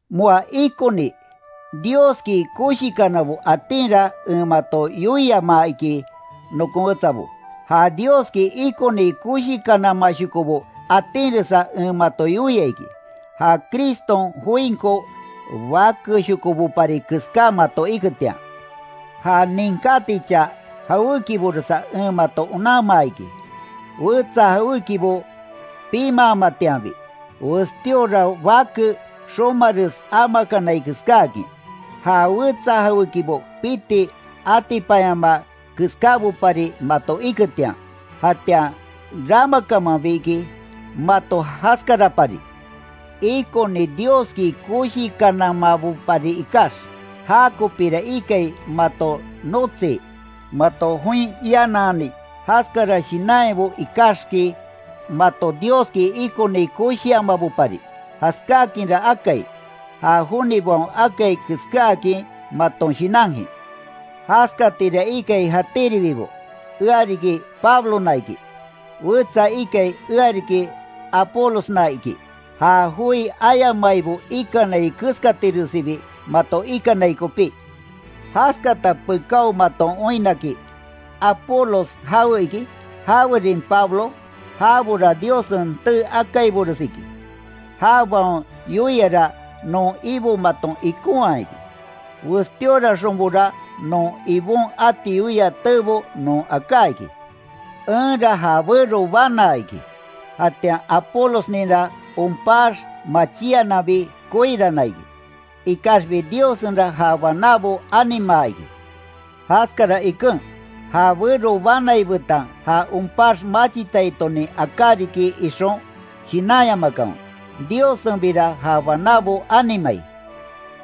Moa ikoni Dioski koshikanabo atinra en mato joi yoiamaa iki nokon wetsabo, ja Dioski ikoni koshikanamashokobo atinresa en mato yoia iki, ja Criston joinko bakeshokobopari keská mato iketian. Ja ninkátichaa jawékiboresa en mato onanmaa iki, wetsa jawékibo pimaamatianbi, westíora bake xomares amakanai keskáakin. Ja wetsa jawékibo piti atipanyamaa keskábopari mato iketian, jatian ramakamanbi iki mato jaskarapari, ikoni Dioski koshikanamabopari ikax. Jakopira ikai mato notsii, mato join ianani. Jaskara shinanyabo ikaxiki, mato Dioski ikoni koshiamabopari. Jaskákinra akai, ja jonibaon akai keskáakin maton shinankin. Jaskatira ikai jatíribibo, ea riki Pablona iki; wetsa ikai ea riki Apolosna iki; ja joi ayamaibo ikai keskatiresibi mato ikanai kopí. Jaskata pekáo maton oinnaki ¿Apolos jawe iki? ¿Jawerin Pablo? Jabora Diossen tee akaibores iki, jabaon yoiara non Ibo maton ikonhaa iki. Westíoraxonbora non Ibon ati yoia teebo non aká iki, Enra ja bero banaa iki, jatian Apolosninra onpax machíananbi koirana iki, ikaxbi Diossenra ja banábo animaa iki. Jaskara iken, ja bero banai betan ja onpax machitaitonin aká riki ixon shinanyamakanwe, Diossenbira ja banábo animai.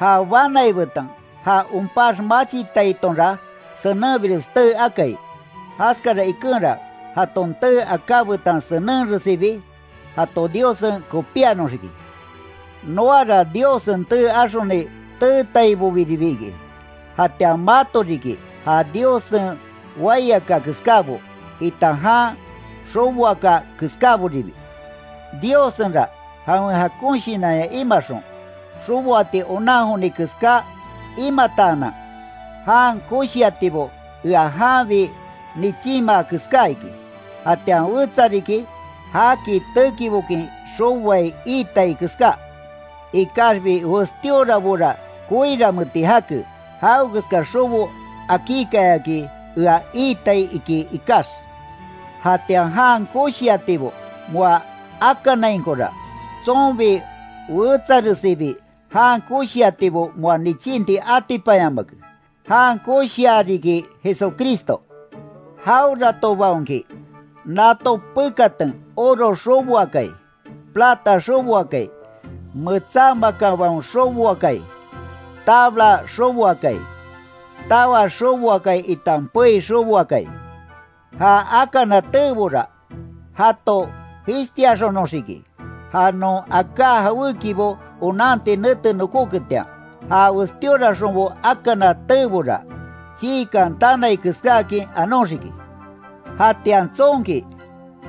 Ja banai betan ja onpax machitaitonra senenbires tee akai, jaskara ikenra, jaton tee aká betan senenresibi jato Diossen kopíanoxiki. Noara Diossen tee axoni teetaibobiribi iki, jatian mato riki, ja Diossen waiaka keskábo, itan jan xoboaka keskáboribi. Diossenra jawen jakon shinanya imaxon, xoboati onan joni keska imataanan, jan koshiatibo ea janbi nichinmaa keská iki. Jatian wetsa riki, jaki tekibokin xoboai iitai keská. Ikaxbi westíorabora koiranmeeti jake, jawekeska xobo akíkayaki ea iitai iki ikax. Jatian jan koshiatibo moa akanainkora, tsonbi wetsaresibi jan koshiatibo moa nichínti atipanyamake, jan koshia riki Jesucristo. Jaweratobaonki nato pekatan oro xoboakai, plata xoboakai, metsá makanbaon xoboakai, tabla xoboakai, tawa xoboakai itan pei xoboakai, ja akana teebora, jato jishtiaxonoxiki, ja non aká jawékibo onanti nete nokoketian. Ja westíoraxonbo akana teebora, chiikan tanai keskáakin anoxiki. Jatian tsonki,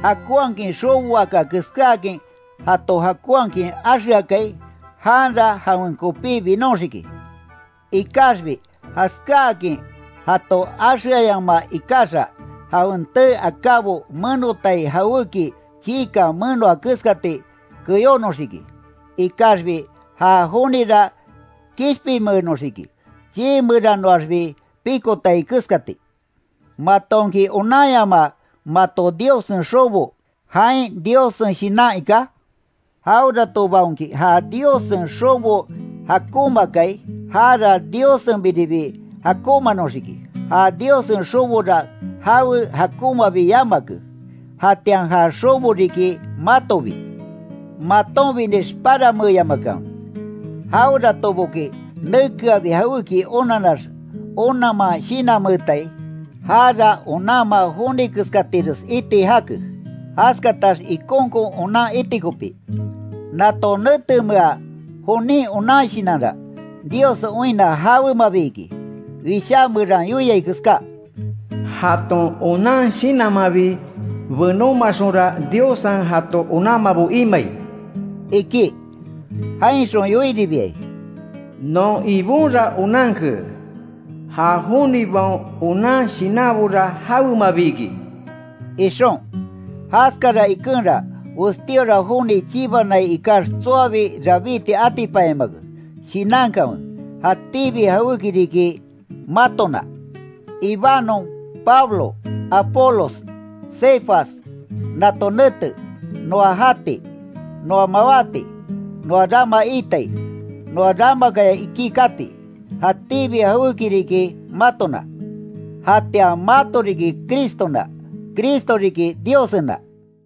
jakonhakin xoboaka keskáakin jato jakonhakin axeakai, janra jawen kopí binoxiki, Ikaxbi jaskáakin jato axeayamaa ikaxa, jawen tee akábo menotai jawéki chiikan menoa keskati keyónoxiki. Ikaxbi ja jonira kishpinmeenoxiki chiimeranoaxbi pikotai keskati. ¿Matonki onanyamaa mato Diossen xobo, jain Diossen Shinan iká? Jaweratobaonki ja Diossen xobo jakonmaakai, jara Diossenbiribi jakonmanoxiki, ja Diossen xobora jawe jakonmabi yamake, jatian ja xobo riki matobi. Matonbinix paranmeeyamakanwe, jaweratoboki nekeabi jawéki onanax onanman shinanmeetai, jara onanma joni keskatires iti jake, jaskatax ikonkon onan iti kopí. Nato netemea jonin onan shinanra, Diossen oinna jawemabi iki. Wishá meran yoiai keská: “Jaton onan shinanmanbi benómaxonra, Diossen jato onanmabo imai”, iki. Jainxon yoiribiai: “Non Ibonra onanke, ja jonibaon onan shinanbora jawemabi iki”, ixon. Jaskara ikenra, westíora joni chibanai ikax tsoabi rabíti atipanyamake. Shinankanwe, jatíbi jawéki riki matona. Ibanon, Pablo, Apolos, Cefas, nato nete, noa jati, noa mawáti, noa rama itai, noa ramakaya ikí kati, jatíbi jawéki riki matona. Jatian mato riki Cristona, Cristo riki Diossena.